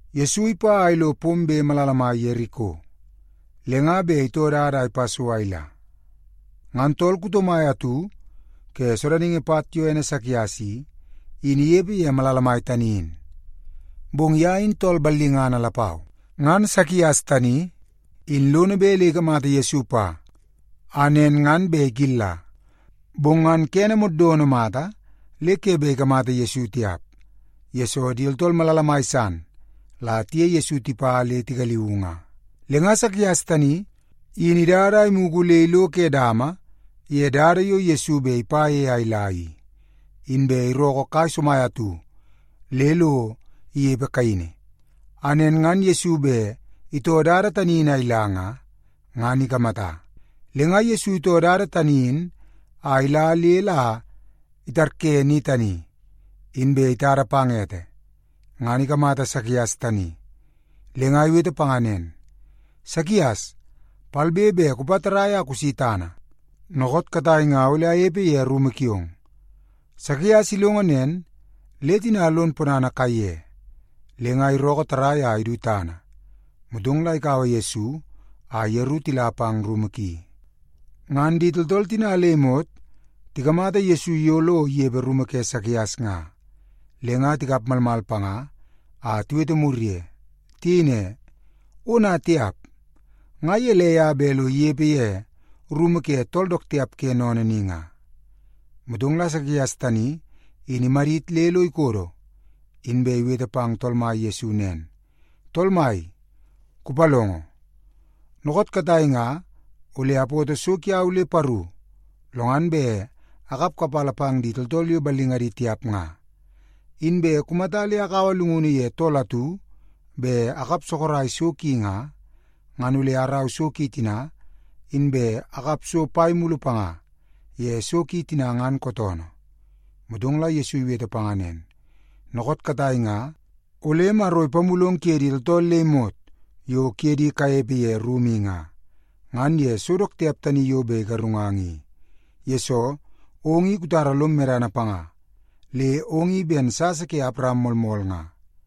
Yesu ipa a ilo pombe malala mai Yeriko, le nga bet itoo dada a ipa so a ila. Ngan tool kuto mai atu ke sodaningi pat yo ene Sakias i, in inepe ye malala mai tani in. Bong ye in tool ballingana lapau. Ngan Sakias tani in lono bet le ikamata Yesu pa, a nen ngan bet ikilla. Bong ngan kene moddono mata le ke bet ikamata Yesu tiap, yesoo di tooltool malala mai san la tiye Yesu tipa le tigaliuu nga. Le nga Sakias tani in idada a imugu le ilo ke dama ye dada yo Yesu bet ipa ye a ila i, inbe irookoo kai somai atu le lo inepe kaini, a nen ngan Yesu bet itoo dada tani in a ila nga, ngan ikamata. Le nga Yesu itoo dada tani in a ila le la itarye ni tani, inbe itada pang ete, ngan ikamata Sakias tani, le nga iwete panga nen, “Sakias, palbe be kupa tarrai a kusi tana! Dookoot katai nga ole anepe ye rumu kiong.” Sakias ilongo nen, le tina lon ponana kaiye. Le nga irookoo tarrai a idu tana, motong la ikaua Yesu a yeru tila pang rumu ki. Ngan di tooltool tina le imot tikamata Yesu yo lo inepe ye rumu ke Sakias nga, le nga tikap malmal panga a tiwete mur ye. Tiyei ne, “Ona tiap! Nga gelei a bet lo inepe ye rumu ke tool dook tiap ke sennene ni nga?” Motong la Sakias tani in imadit le lo ikodo, inbe iwete pang Tool Mai Yesu nen, “Tool Mai, kupalongo! Dookoot katai nga ole apoto so kiau le paru, lo ngan bet akap kapala pang di tooltool yo ballingadi tiap nga. Inbe kumata le akaua llungunu ye tool atu bet akap sorok so ki nga, ngan ole araua so ki tina, inbe akap so pai mulu panga ye so ki tina ngan kootoonoo.” Motong la Yesu iwete panga nen, “Dookoot katai nga ole Maro ipamulong kuye di tooltool le imot yo kuye di kanepe ye rumu i nga, ngan ye so dook tiap tani yo bet igarungang i, yesoo ong i kutara lom medana panga, le ong i ben sasa ke Awaram moolmool nga.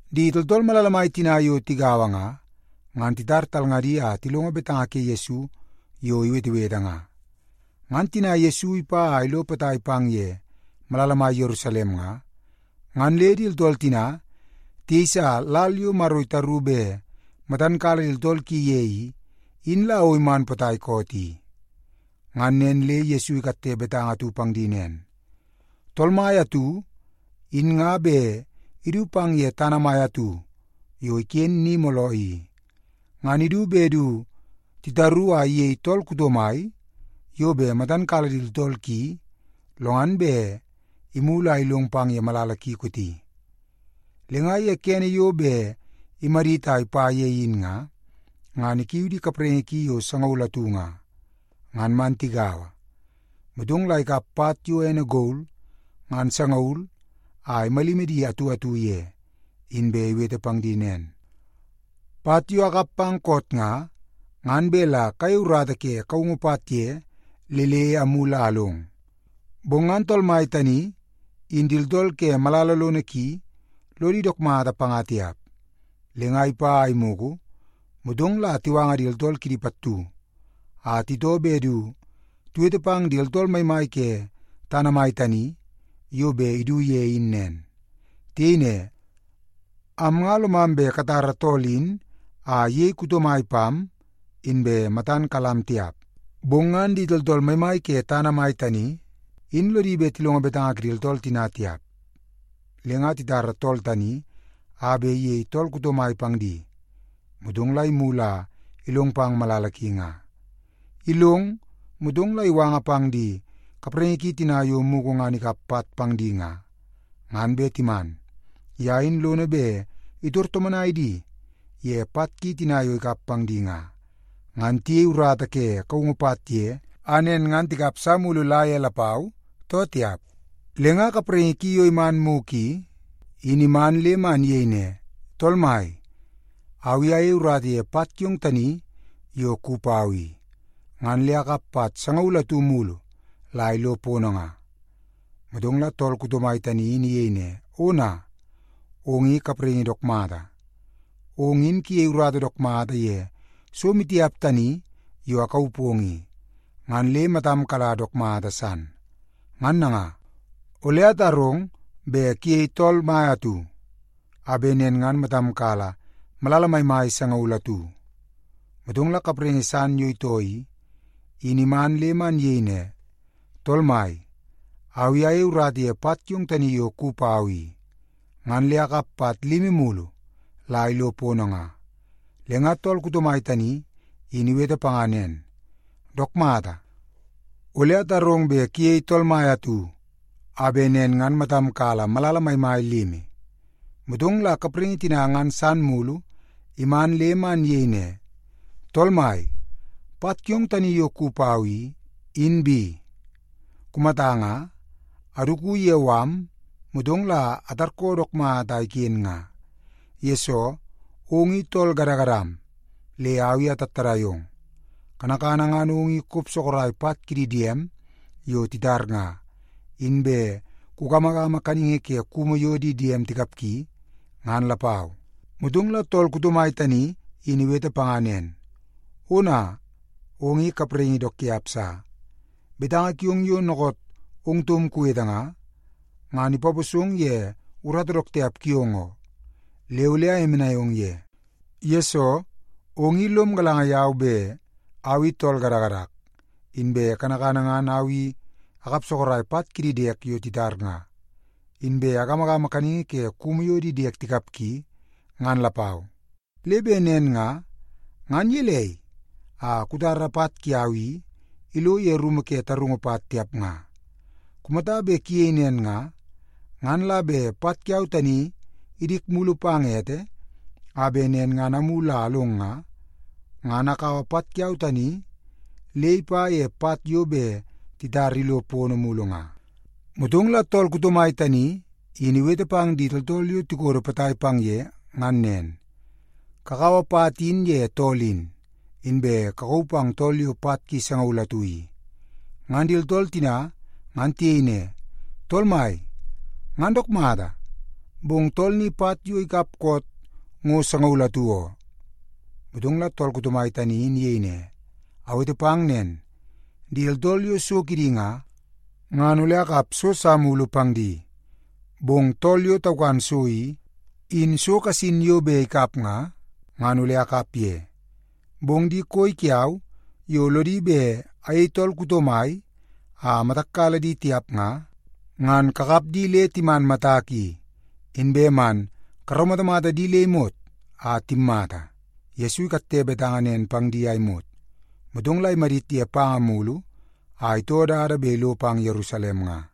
Di tooltool malala mai tina yo tigaua nga, ngan titar talngadi a tilongo betanga ke Yesu yo iwetewete nga. Ngan tina Yesu ipa a ilo potai pang ye malala mai Yerusalem nga, ngan le di tooltool tina tiyeisa lal yo Maro itaru bet matan kala di tooltool ki ye i, in la o iman potai koot i. Ngan nen le Yesu ikatte betanga atu pang di nen, “Tool mai atu, in nga bet idu pang ye tana mai atu yo iken ni mooloo i, ngan idu bet du titaru a iyei tool kuto mai yo bet matan kala di tooltool ki, lo ngan bet imulu a ilong pang ye malala ki kooti. Le nga ye kene yo bet imadit a ipa ye in nga, ngan ikiu di kapraingi ki yo sangaul atu nga, ngan man tigaua. Motong la ikap pat yo ene gol ngan sangaul a imalimi di atu atu ye, inbe iwete pang di nen, ‘Pat yo akap pang koot nga, ngan bet la kayei urata ke kaungu pat ye le le amulu a along.’ “Bong ngan tool mai tani in di tooltool ke malala lono ki, lodi dook mata panga tiap. Le nga ipa a imugu, motong la tiwanga di tooltool kidi pattu a titoo bet du tiwete pang di tooltool maimai ke tana mai tani yo bet idu ye in nen. Tiyei ne, ‘Am nga lomam bet katara tool in a iyei kuto mai pam, inbe matan kalam tiap.’ “Bong ngan di tooltool maimai ke tana mai tani in lodi bet tilongo betanga kidi tooltool tina tiap. Le nga titara tool tani a bet iyei tool kuto mai pang di, motong la imulu a ilong pang malala ki nga. Ilong, motong la iwanga pang di kapraingi ki tina yo mugu ngan ikap pat pang di nga, ngan bet timan. Ye in lono bet itor tomonai di ye pat ki tina yo ikap pang di nga, ngan tiyei urata ke kaungu pat ye, a nen ngan tikap sa mulu la ye lapau, too tiap? “Le nga kapraingi ki yo iman mugu i, in iman le man iyei ne, ‘Tool mai, au i ayei urata ye pat kiong tani yo kuwi pau i, ngan le akap pat sangaul atu mulu la ilo pono nga.’ “Motong la tool kuto mai tani in iyei ne, ‘Ona, ong i kapraingi dook mata! Ong in kuyei urata dook mata ye so maitiap tani yo akauu pong i, ngan le matam kala dook mata san. Ngan nanga, ole atarong bet kuyei tool mai atu a bet nen ngan matam kala malala maimai sangaul atu.’ “Motong la kapraingi san yo itoo i, in iman le man iyei ne, ‘Tool mai, au i ayei urata ye pat kiong tani yo kuwi pau i, ngan le akap pat limi mulu la ilo pono nga.’ “Le nga tool kuto mai tani in iwete panga nen, ‘Dook mata, ole atarong bet kuyei tool mai atu a bet nen ngan matam kala malala maimai limi.’ “Motong la kapraingi tina ngan san mulu iman le man iyei ne, ‘Tool mai, pat kiong tani yo kuwi pau i, in bi. Kumata nga, aduku ye mala, motong la atarkoo dook mata a iken nga, yesoo ong i tool gadagadam le au i atattadai ong. Kanakana ngan ong i kop sorok pat kidi diem yo titar nga, inbe kugamagama kaningi ke kumu yo di diem tikapgi, ngan lapau.’ “Motong la tool kuto mai tani in iwete panga nen, ‘Ona, ong i kapraingi dook tiap sa! Betanga kiong yo dookoot ong taum kuwete nga, ngan ipaposong ye urata dook tiap kiong oo. Le ole ayemenai ong ye. Yesoo, ong i lom galanga yau bet au i tool gadagadak, inbe kanakana ngan au i akap sorok pat kidi diek yo titar nga, inbe agamagama kaningi ke kumu yo di diek tikapgi, ngan lapau. Le bet nen nga, ngan gelei a kutara pat kiau i ilo ye rumu ke tarungu pat, tiap nga? Kumata bet kuyei nen nga, ngan la bet pat kiau tani idik mulu pang ete, a bet nen ngan amulu a along nga, ngan akaua pat kiau tani le ipa ye pat yo bet titar ilo pono mulu nga.’ “Motong la tool kuto mai tani in iwete pang di tooltool yo tikodo potai pang ye ngan nen, ‘Kakaua pat in ye tool in, inbe kakauu pang tool yo pat ki sangaul atu i.’ “Ngan di tooltool tina ngan tiyei ne, ‘Tool mai, ngan dook mata, bong tool ni pat yo ikap koot ngo sangaul atu oo!’ “Motong la tool kuto mai tani in iyei ne, ‘Awete pang nen, di tooltool yo so kidi nga, ngan ole akap so sa mulu pang di. Bong tool yo taukan so i, in so kasin yo bet ikap nga, ngan ole akap ye. Bong di koi kiau yo lodi bet ayei tool kuto mai a matak kala di tiap nga, ngan kakap di le timan matak i, inbe man karaumatamata di le imot a timmata.’” Yesu ikatte betanga nen pang di a imot, motong la imadit ye panga mulu a itoo dada bet ilo pang Yerusalem nga.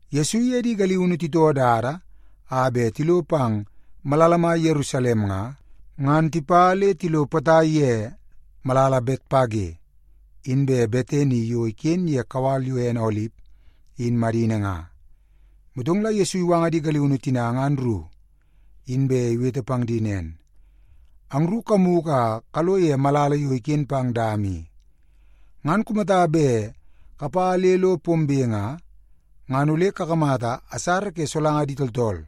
Yesu iye di galiunu titoo dada a bet tilo pang malala mai Yerusalem nga, ngan tipa le tilo potai ye malala Betpage inbe Betani yo iken ye kawal yo ene Olip in madini nga. Motong la Yesu iwanga di galiunu tina ngan ru, inbe iwete pang di nen, “Angru kamugu a kalo ye malala yo iken pang dama i. Ngan kumata bet kapa le lo pombe nga, ngan ole kakamata asara ke solanga di tooltool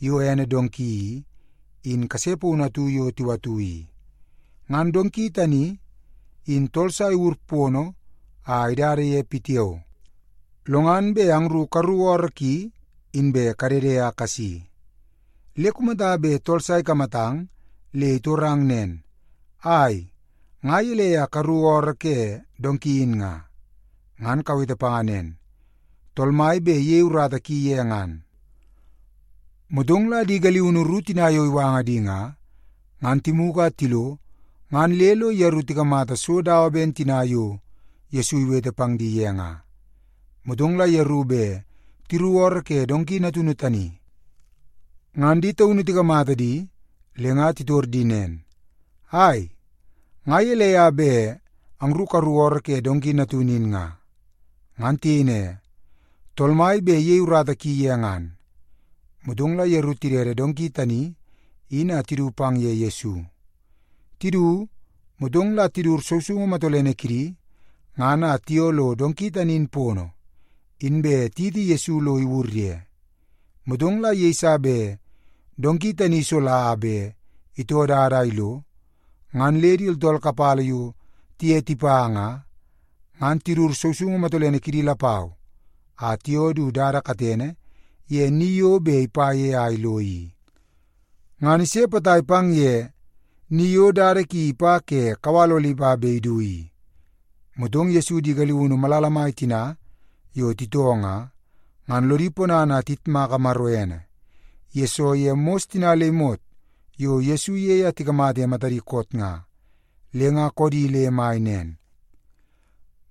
yo ene donki i, in kase paunu atu yo tiwatu i. Ngan donki tani in tool sa iwur pono a idada ye pitiao. Lo ngan bet angru karuku ooroo ki, inbe kadede a kasi. Le kumata bet tool sa ikamatang le itorang nen, ‘Ai, nga gelei a karuku ooroo ke donki in nga?’ ngan kawete panga nen, ‘Tool Mai bet iyei urata ki ye ngan.’” Motong la di galiunu ru tina yo iwanga di nga, ngan timugu a tilo ngan le lo yeru tikamata so dawa ben tina yo Yesu iwete pang di ye nga. Motong la yeru bet tiruku ooroo ke donki natunu tani, ngan di taunu tikamata di le nga titor di nen, “Ai, nga gelei a bet angru karuku ooroo ke donki natunu in nga?” Ngan tiyei ne, “Tool Mai bet iyei urata ki ye ngan.” Motong la yeru tidede donki tani in a tidu pang ye Yesu. Tidu, motong la tidut sousoungu matolene kidi ngan a tiyoo lo donki tani in pono, inbe tiyiti Yesu lo iwur ye. Motong la yeiso bet donki tani isola a bet itoo dada a ilo, ngan le di tooltool kapala yo tiye tipa nga, ngan tidut sousoungu matolene kidi lapau a tiyoo du dada katene ye ni yo bet ipa ye a ilo i. Ngan ise potai pang ye ni yo dada ki ipa ke kawal Olip a bet idu i, motong Yesu di galiunu malala mai tina yo titoo nga, ngan lodi ponana a tiyitmaka Maro ene, yesoo ye mos tina le imot yo Yesu iyei a tikamata ye matadi koot nga. Le nga koodi le mai nen,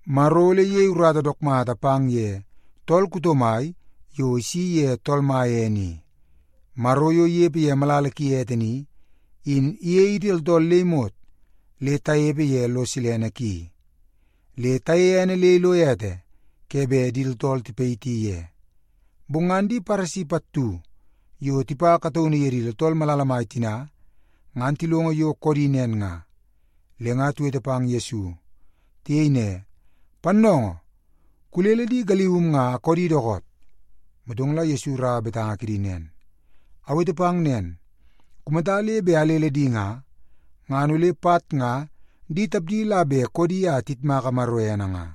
“Maro ole iyei urata dook mata pang ye tool kuto mai yo isi ye Tool Mai ene i. Maro yo inepe ye malala ki ete ni, in iyei idi tooltool le imot le tanepe ye lo silene ki. Le tayeie ene le ilo ete ke bet di tooltool tipayiti ye!” Bong ngan di Paresi pattu yo tipa kataunu ye di tooltool malala mai tina ngan tilongo yo koodi nen nga, le nga tiwete pang Yesu. Tiyei ne, “Pannoongoo, kulele di galium nga a koodi dookoot!” Motong la Yesu iraua betanga kidi nen, “Awete pang nen, kumata le bet alele di nga, ngan ole pat nga di tapdi la bet koodi a tiyitmaka Maro ene nga.”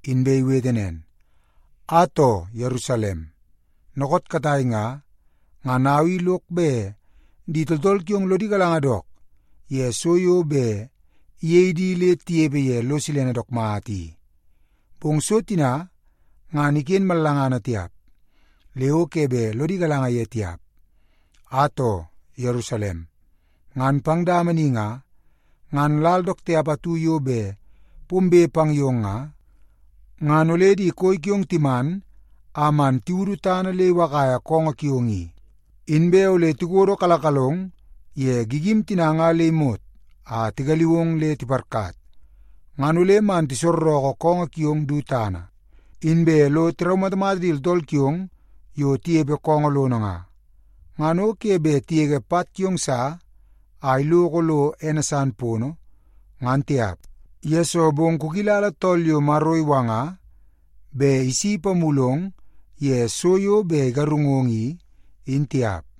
Inbe iwete nen, “Atoo, Yerusalem, dookoot katai nga, ngan au i lok bet di tooltool kiong lodi galanga dook ye so yo bet iyei di le tinepe ye lo silene dook mata i. Bong so tina ngan iken mallangana tiap, le o ke bet lodi galanga ye tiap. Atoo, Yerusalem, ngan pang dama ni nga, ngan lal dook tiap atu yo bet pombe pang yong nga, ngan ole di koi kiong timan a man tiwudu tana le iwakaia koongoo kiong i. Inbe ole tikodokalakalong ye gigim tina nga le imot a tigaliu ong le tiparkat. Ngan ole man tisorreke koongoo kiong du tana, inbe lo tiraumatamata di tooltool kiong yo tinepe koongoo lono nga. Ngan o ke bet tigege pat kiong sa a iloko lo ene san pono, ngan tiap, yesoo bong kukilala tool yo Maro iwanga bet isi ipamulong ye so dook tiap yo bet igarungong i, in tiap.”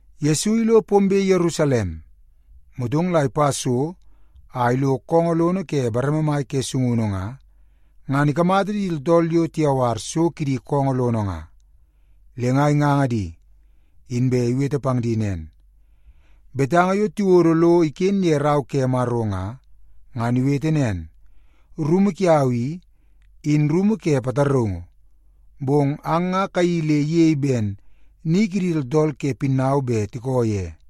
Yesu ilo pombe Yerusalem, motong la ipa so a ilo koongoo lono ke bareme mai ke sungunu nga, ngan ikamata di tooltool yo tiyawar so kidi koongoo lono nga. Le nga inganga di, inbe iwete pang di nen, “Betanga yo tiwodo lo iken ye Rau ke Maro nga, ngan iwete nen, ‘Rumu kiau i, in rumu ke pataraungu.’ Bong ang nga kayeii le iyei ben ‘ni kidi tooltool ke pinnau bet tiko ye.’”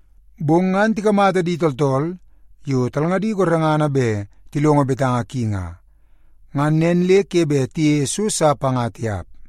Bong ngan tikamata di tooltool yo talngadi gorengana bet tilongo betanga ki nga, ngan nen le ke bet tiyeie so sa panga tiap.